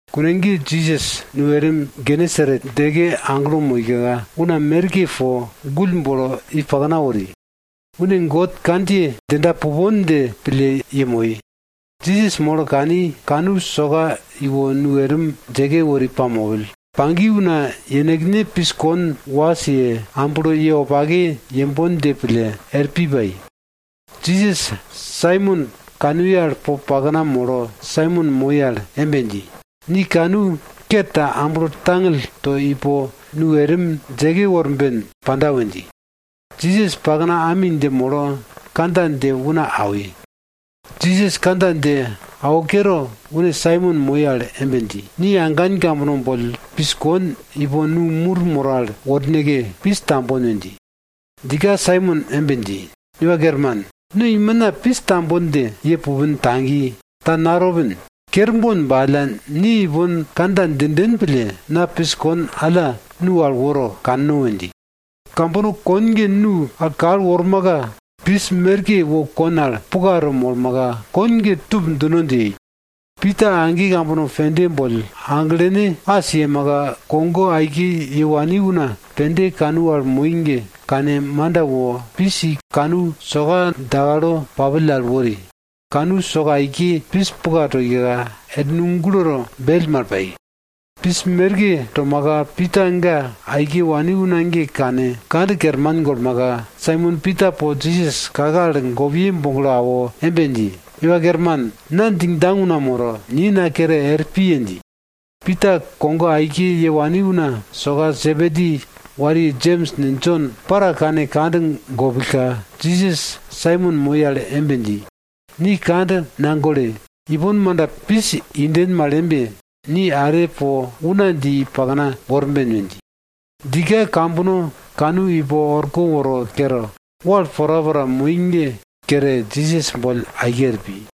Kune ge Jisas nu erim Genesaret djeke aglo moika, una merke po gull bolo i pakna wori, une God kandjiye djinda pupon dje pille yemoi. Jisas molo kani, kanu soka iwo nu erim djeke wori pamopill. Pagi una yenekne pis kon was ye, amblo ye wopake yembon dje pille er pi pai. Jisas Saimon kanuye al po pakna molo Saimon moi al embe dji, ni kanu ker ta amblo tangill to ipo nu erim djeke worben panda we dji. Jisas pakna ami dje molo kandja dje una awi. Jisas kandja dje awo kere, une Saimon moi al embe dji, ni agan kambono boll pis kon ipo nu mur moro al worneke, pis tambon we dji. Djika Saimon embe dji, Iwa Kerman, no imina pis tambon dje ye pupin tagi, ta natopin. Kerbon ba alla, ni ipon kandja djinden pille, na pis kon alla nu al woro kanno we dji. Kambono kon ge nu al kal wormaka, pis merke wo kon al puka to molmaka, kon ge tup djino dje yei. Pita age kambono pende boll aglene as yemaka, kogo aike ye wani una pende kanu al moi ge, kane manda wo pis i kanu soka dakalo papill al wori, kanu soka aike pis puka toika, er nu guloto bell mal pai. Pis merke tomaka, Pita ga aike wani una ge kane, kand kerman golmaka, Saimon Pita po Jisas kake al gopiye boglo awo embe dji, Iwa Kerman, na djingdjang una moro, ni na kere er piye! dji. Pita kogo aike ye wani una soka Sebedi wariye Jems ne, Jon para kane kand gopillka, Jisas Saimon moi al embe dji, ni kand nagole! Ipon manda pis inden mal embe, ni are po una dje i pakna worben we dji. Djika kambono kanu ipo orko woro kere, wal porapora moi ge kere, Jisas boll aike er pi.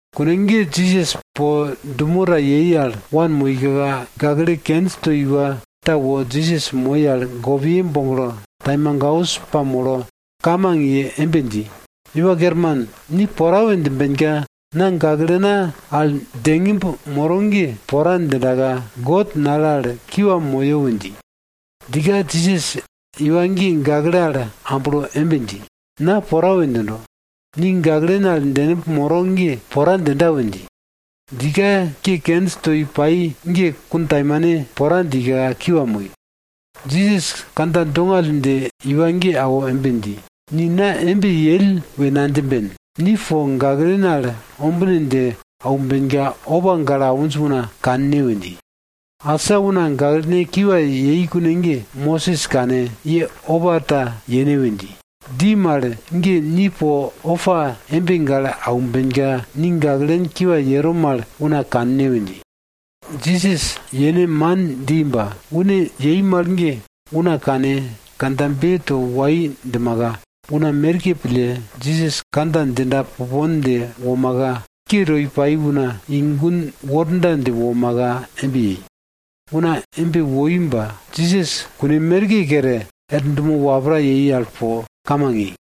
Kune ge Jisas po dumo ta yei al wanmoika, gakle kenj toi iwa ta wo Jisas moi al kake gopiye boglo taimagaus pamolo kamang ye embe dji, Iwa Kerman, ni pora we djimbenka, na gaklena al djengimb moro ge pora djindaka God nale al na kiwa moyo we dji. Djika Jisas iwa ge gakle al amblo embe dji, na pora we djindo. Ni gaklen al djengimb moro ge pora djinda we dji. Djika ke kenj toi pai ge kuntaimane pora djika, kiwa moi. Jisas kandja dongall dje iwa ge awo embe dji, ni na embe yell we nadjimben. Ni po gaklen al ombine dje aumbenka, opa gale awinj una kanne we dji. Asa una gaklene kiwa yei kune ge, Mosis kane, ye opa ta yene we dji. Dji mal ge ni po opa embe gale aumbenka, ni gaklen kiwa yero mal una kanne we dji. Jisas yene man dji ba, une yei mal ge una kane kandjabe to wai djimaka, una merke pille Jisas kandja djinda pupon dje womaka, ke to pai una i gun worda dje womaka embe yei. Una embe woi ba Jisas kune merke kere, er dumo wapra yei al po kamang yei.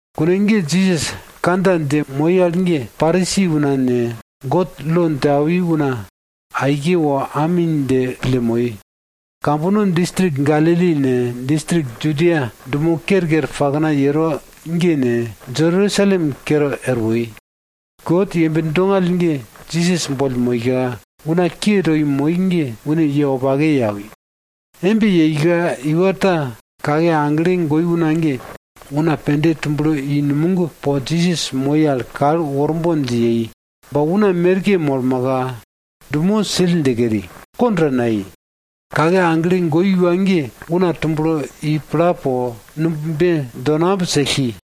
Kune ge Jisas kandja dje moi al ge, Parisi una ne, God lo dje awi una aike wo ami dje pille moi. Kambono distrik Galili ne, distrik Judia dumo kerker pakna yero ge ne, Jerusalem kere er woi. God yembe dongall ge Jisas boll moika, una ke toi moi ge une ye wopake ye awi. Embe yeika iwa ta kake agle goi una ge, una pende tumblo i numog po Jisas moi al kal worbon dje yei, ba una merke molmaka, dumo sill dje keri, kond ta nayei. Kake agle goi iwa ge una tumblo i pla po, numb be donamb sellki.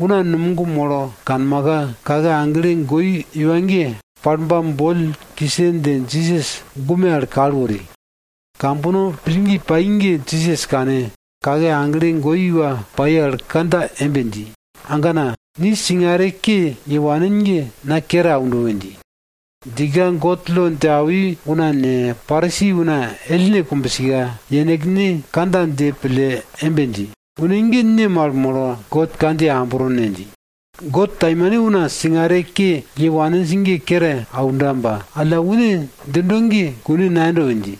Una numog molo kanmaka, kake agle goi iwa ge palbam boll kise dje Jisas gume al kal wori. Kambono pillgi pai ge Jisas kane, kake agle goi iwa pai al kandja embe dji, agana, ni singare ke ye wanin ge na kere aundo we dji. Djika God lo dje awi una ne, Parisi una ellne kumbsika, yenekne kandja dje pille embe dji, une ge ne mal molo God kandjiye ambro ne? dji. God taimane una singare ke ye waninj ge kere aunda ba alla, une djindo ge kune nayendo we dji.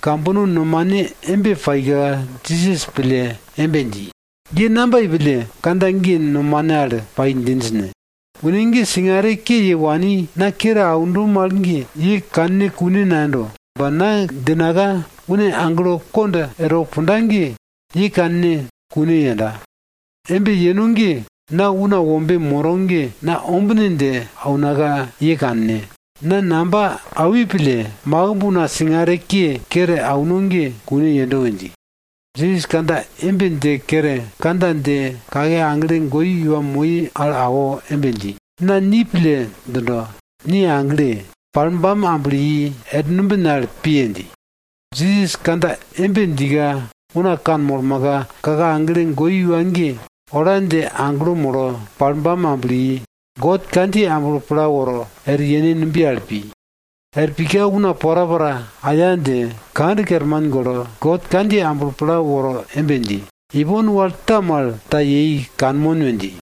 Kambono nomane embe paika, Jisas pille embe dji, ye namba yei pille kandja ge nomane al pai djinj ne? Une ge singare ke ye wani na kere aundo mal ge ye kanne kune nayendo. Ba na djinaka une aglo kond erwo punda ge, ye kanne kune yenda. Embe yeno ge na Una Wombe moro ge na ombine dje aunaka ye kanne. Na namba awi pille, makimb una singare ke, kere auno ge kune yendo we dji. Jisas kandja embe dje kere kandja dje kake agle goi iwa moi al awo embe dji, na ni pille djindo, ni agle! Palbam amblo i er numbin al piye! dji. Jisas kandja embe djika una kanmolmaka, kake agle goi iwa ge, ola dje aglo molo palbam amblo i. God kandjiye amblo pla woro, er yene numbiye al pi. Er pika una porapora aya dje, kand kerman golo, God kandjiye amblo pla woro embe dji, ipon wal ta mal ta yei kanmon we dji.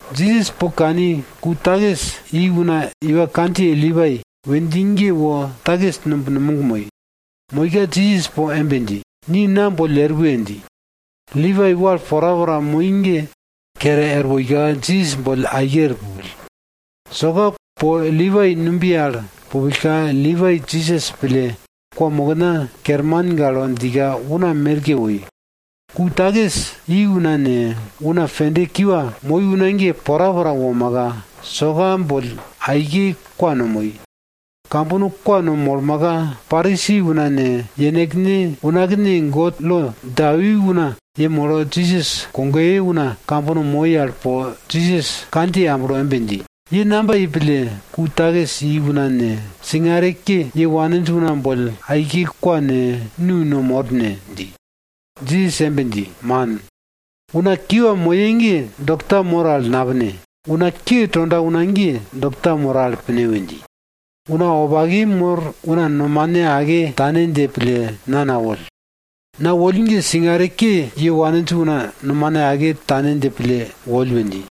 Jisas po kani ku takis i una iwa kandjiye Lipai we dji ge wo takis numb numog moi. Moika Jisas po embe dji, ni na boll er we! dji. Lipai wal porapora moi ge kere er woika, Jisas boll aike er pupill. Soka po Lipai numbiye al pupillka, Lipai Jisas pille kwamokna kerman gale djika una merke woi. Ku takis i una ne, una pende kiwa moi una ge porapora womaka, soka boll aike kwa no moi. Kambono kwa no molmaka, Parisi una ne, yenekne unakne God lo dje awi una yemolo Jisas kogoye una kambono moi al po Jisas kandjiye amblo embe dji, ye namba yei pille ku takis i una ne, singare ke ye waninj una boll aike kwa ne, nu no mor ne? dji. Jisas embe dji, man, una kiwa moye ge dokta mor al napine, una ke tonda una ge dokta moro al pine we dji. Una wopake mor una nomane ake tane dje pille na nawoll. Na woll ge singare ke ye waninj una nomane ake tane dje pille woll we dji.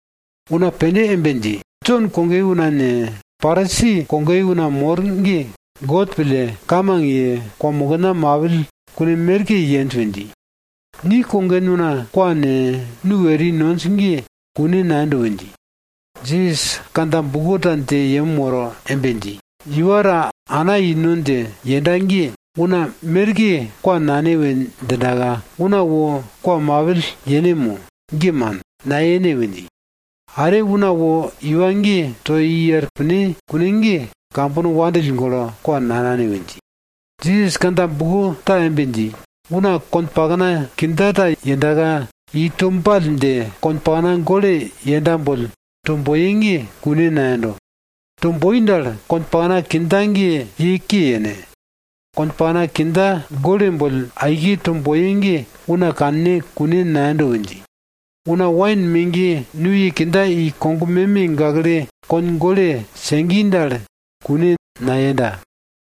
Una pende embe dji, Jon kogoye una ne, Parisi kogoye una mor ge God pille, kamang ye, kwamokna mapill kune merke yenj we dji. Ni kogen una kwa ne, nu eri nonj ge kune nayendo we dji. Jisas kandja buko ta dje yem woro embe dji, iwa ta ana ino dje yenda ge, una merke kwa nane we djindaka, una wo kwa mapill yene mo? Ge man, nayene we dji. Are una wo iwa ge to i er pine kune ge, kambono wandill golo kwa nanane we dji. Jisas kandja buko ta embe dji, una konpakna kindja ta yendaka, i to ball dje konpakna gole yenda boll to boye ge kune nayendo. To boi dal, konpakna kindja ge ye ke yene. Kon pakna kindja gole boll aike to boye ge una kanne kune nayendo we dji. Una wain megiye nuye kindja i kog meme gakle kon gole segi dal kune nayenda.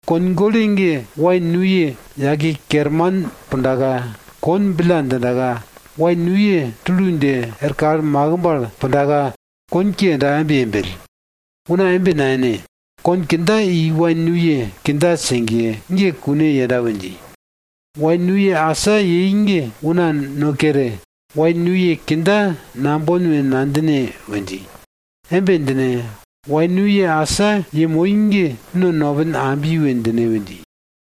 Kon gole ge, wain nuye yake kerman pundaka, kon billa djindaka, wain nuye tulu dje er kal makimb al pundaka, kon ke yendaka embe yembell. Una embe nayene. Kon kindja i wain nuye kindja segiye ge kune yenda we dji. Wain nuye asa yei ge una no kere, wain nuye kindja nambon we nadjine we dji. Embe djine, wain nuye asa yemoi ge no nopin ambi we djine we dji.